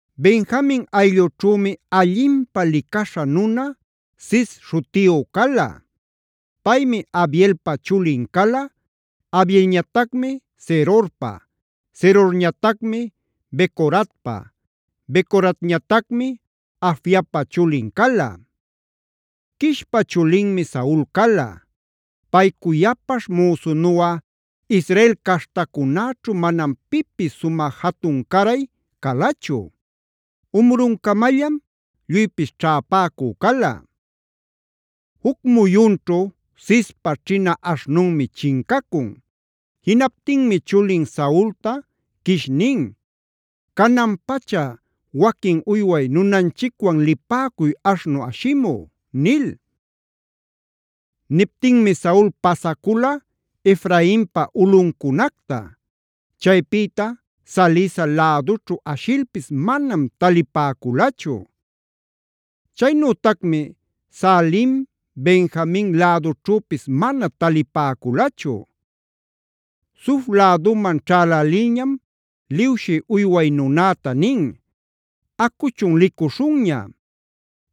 Benjamin ayllućhümi allinpä licaśha nuna Cis śhutiyu cala. Paymi Abielpa chulin cala, Abielñatacmi Zerorpa, Zerorñatacmi Becoratpa, Becoratñatacmi Afiapa chulin cala. Quishpa chulinmi Saul cala. Pay cuyapaśh müsunuꞌa Israel caśhtacunäćhu manam pipis sumä jatun-caray calachu. Umruncamallam lluypis ćhäpäcü cala. Juc muyunćhu Cispa ćhina aśhnunmi chincacun. Jinaptinmi chulin Saulta Quish nin: “Canan-pacha waquin uyway nunanchicwan lipäcuy aśhnu ashimü” nil. Niptinmi Saul pasacula Efrainpa ulꞌuncunacta; chaypïta Salisa lädućhu ashilpis manam talipäculachu. Chaynütacmi Saalim, Benjamin lädućhüpis mana talipäculachu. Zuf läduman ćhälälilñam liwshi uyway nunäta nin: “Acuchun licuśhunña.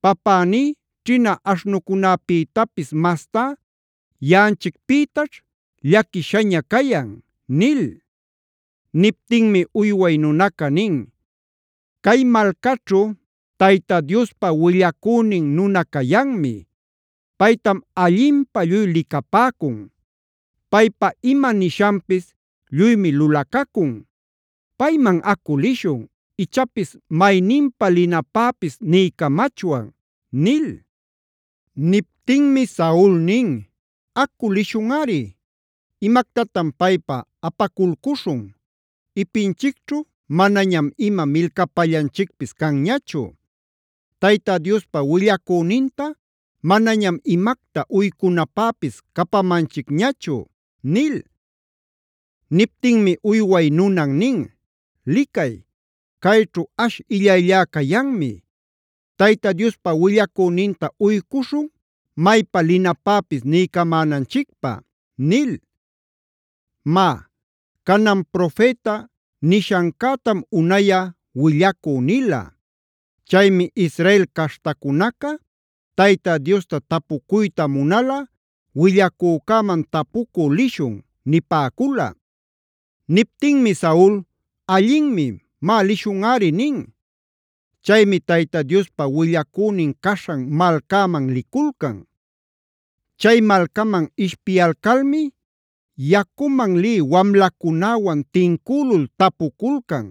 Papäní ćhina aśhnucunäpïtapis mastá yaꞌanchicpïtaćh llaquishaña cayan” nil. Niptinmi uyway nunaca nin: “Cay malcaćhu Tayta Diospa willacünin nuna cayanmi. Paytam allinpä lluy licapäcun. Paypa ima nishanpis lluymi lulacacun. Payman acu lïshun, ichapis mayninpa linapäpis niycamachwan” nil. Niptinmi Saul nin: “Acu lïshunꞌari. ¿Imactatan paypa apaculcuśhun? Ipinchicćhu manañam ima milcapallanchicpis canñachu. Tayta Diospa willacüninta manañam imacta uycunapäpis capamanchicñachu” nil. Niptinmi uyway nunan nin: “Licay, cayćhu ash illayllá cayanmi. Tayta Diospa willacüninta uycuśhun maypa linapäpis niycamänanchicpä” nil. (Má, Canan “profeta” nishancätam unayꞌa willacü nila. Chaymi Israel caśhtacunaca Tayta Diosta tapucuyta munalꞌa “willacücäman tapucü lishun” nipäcula.) Niptinmi Saul: “Allinmi. Má lishunꞌari” nin. Chaymi Tayta Diospa willacünin caśhan malcäman liculcan. Chay malcaman ishpiyalcalmi yacuman lï wamlacunäwan tincülul tapuculcan: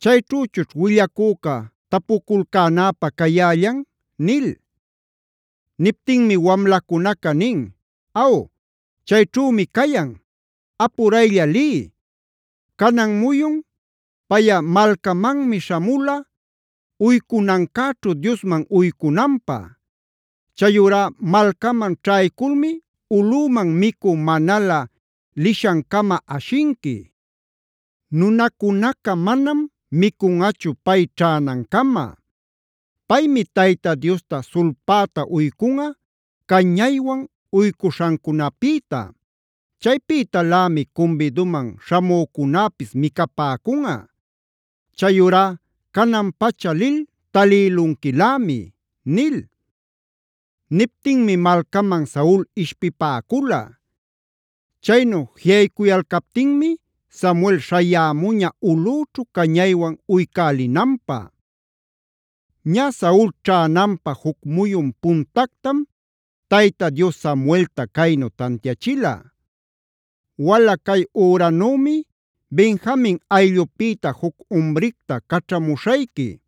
“¿Chayćhüchućh willacüca tapuculcänäpä cayällan?” nil. Niptinmi wamlacunaca nin: “Aw, chayćhümi cayan. Apuraylla liy; canan muyun payꞌa malcamanmi śhamula päganancäćhu Diosman uycunanpä. Chayurá malcaman ćhayculmi ulꞌüman micü manalä lishancama ashinqui. Nunacunaca manam micunꞌachu pay ćhänancama. Paymi Tayta Diosta sulpäta uycunꞌa cañaywan uycuśhancunapïta. Chaypïtalämi cumbiduman śhamücunäpis micapäcunꞌa. Chayurá canan-pacha lil talïlunquilämi” nil. Niptinmi malcaman Saul ishpipäcula. Chaynu jiꞌaycuyalcaptinmi Samuel śhayämuña ulꞌüćhu cañaywan uycälinanpä. Ñä, Saul ćhänanpä juc muyun puntactam Tayta Dios Samuelta caynu tantiachila: “Wala cay üranümi Benjamin ayllupïta juc umricta caćhamuśhayqui.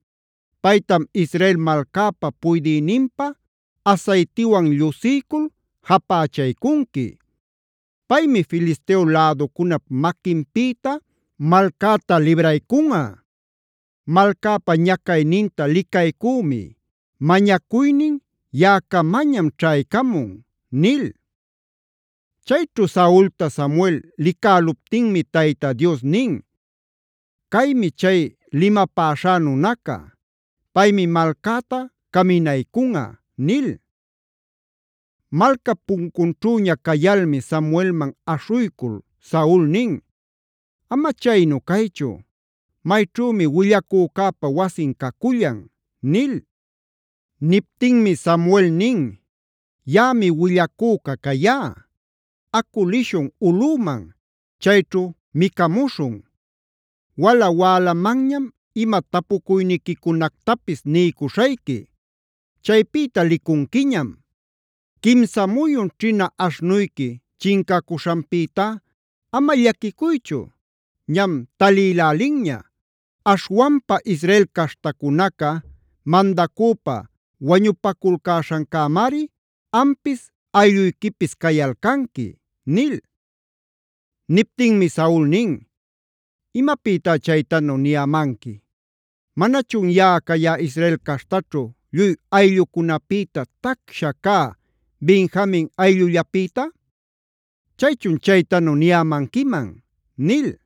Paytam Israel malcäpa puydïninpä asaytiwan llusiycul japächaycunqui. Paymi Filisteo läducunap maquinpïta malcäta libraycunꞌa. Malcäpa ñacayninta licaycümi; mañacuynin yaꞌacamañam ćhaycamun” nil. Chayćhu Saulta Samuel licäluptinmi Tayta Dios nin: “Caymi chay limapäśhá nunaca. Paymi malcäta caminaycunꞌa” nil. Malcap puncunćhüña cayalmi Samuelman aśhuycul Saul nin: “Ama chaynu caychu, ¿mayćhümi willacücäpä wasin cacullan?” nil. Niptinmi Samuel nin: “Yaꞌami willacüca cayá. Acu lishun ulꞌüman; chayćhu micamuśhun. Wala-wälamanñam ima tapucuyniquicunactapis niycuśhayqui; chaypïta licunquiñam. Quimsa muyun ćhina aśhnuyqui chincacuśhanpïtá ama llaquicuychu; ñam talïlälinña. Aśhwanpa Israel caśhtacunaca mandacüpa wañupaculcäśhancämari ampis aylluyquipis cayalcanqui” nil. Niptinmi Saul nin: “¿Imapïtá chaytanu niyämanqui? ¿Manachun yaꞌa cayá Israel caśhtaćhu lluy ayllucunapïta tacsha cä Benjamin ayllullapïta? ¿Chaychun chaytanu niyämanquiman?” nil.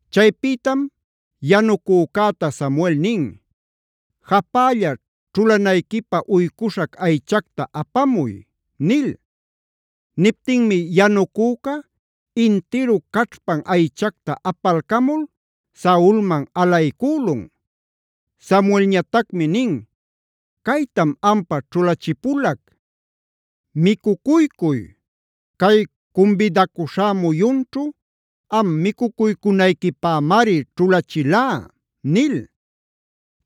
Chaypïtam yanucücäta Samuel nin: “Japälla ćhulanayquipä uycuśhac aychacta apamuy” nil. Niptinmi yanucüca intiru caćhpan aychacta apalcamul Saulman alaycülun. Samuelñatacmi nin: “Caytam ampa ćhulachipulac; micucuycuy. Cay cumbidacuśhá muyunćhu am micucuycunayquipämari ćhulachilá” nil.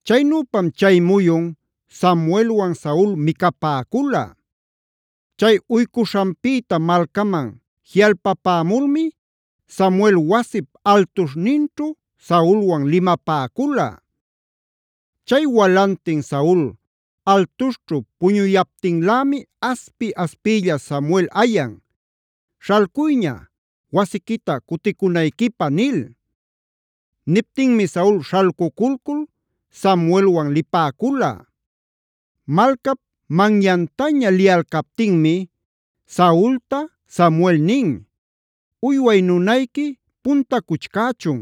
Chaynüpam chay muyun Samuelwan Saul micapäcula. Chay pägaśhanpïta malcaman jiꞌalpapämulmi Samuel wasip altuśhninćhu Saulwan limapäcula. Chay walantin Saul altuśhćhu puñuyaptinlämi aspi-aspiylla Samuel ayan: “Śhalcuyña, wasiquita cuticunayquipä” nil. Niptinmi Saul śhalcuculcul Samuelwan lipäcula. Malcap manyantaña liyalcaptinmi Saulta Samuel nin: “Uyway nunayqui puntacuchcächun.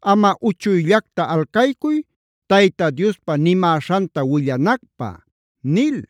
Amꞌa uchuyllacta alcaycuy Tayta Diospa nimäśhanta willanacpä” nil.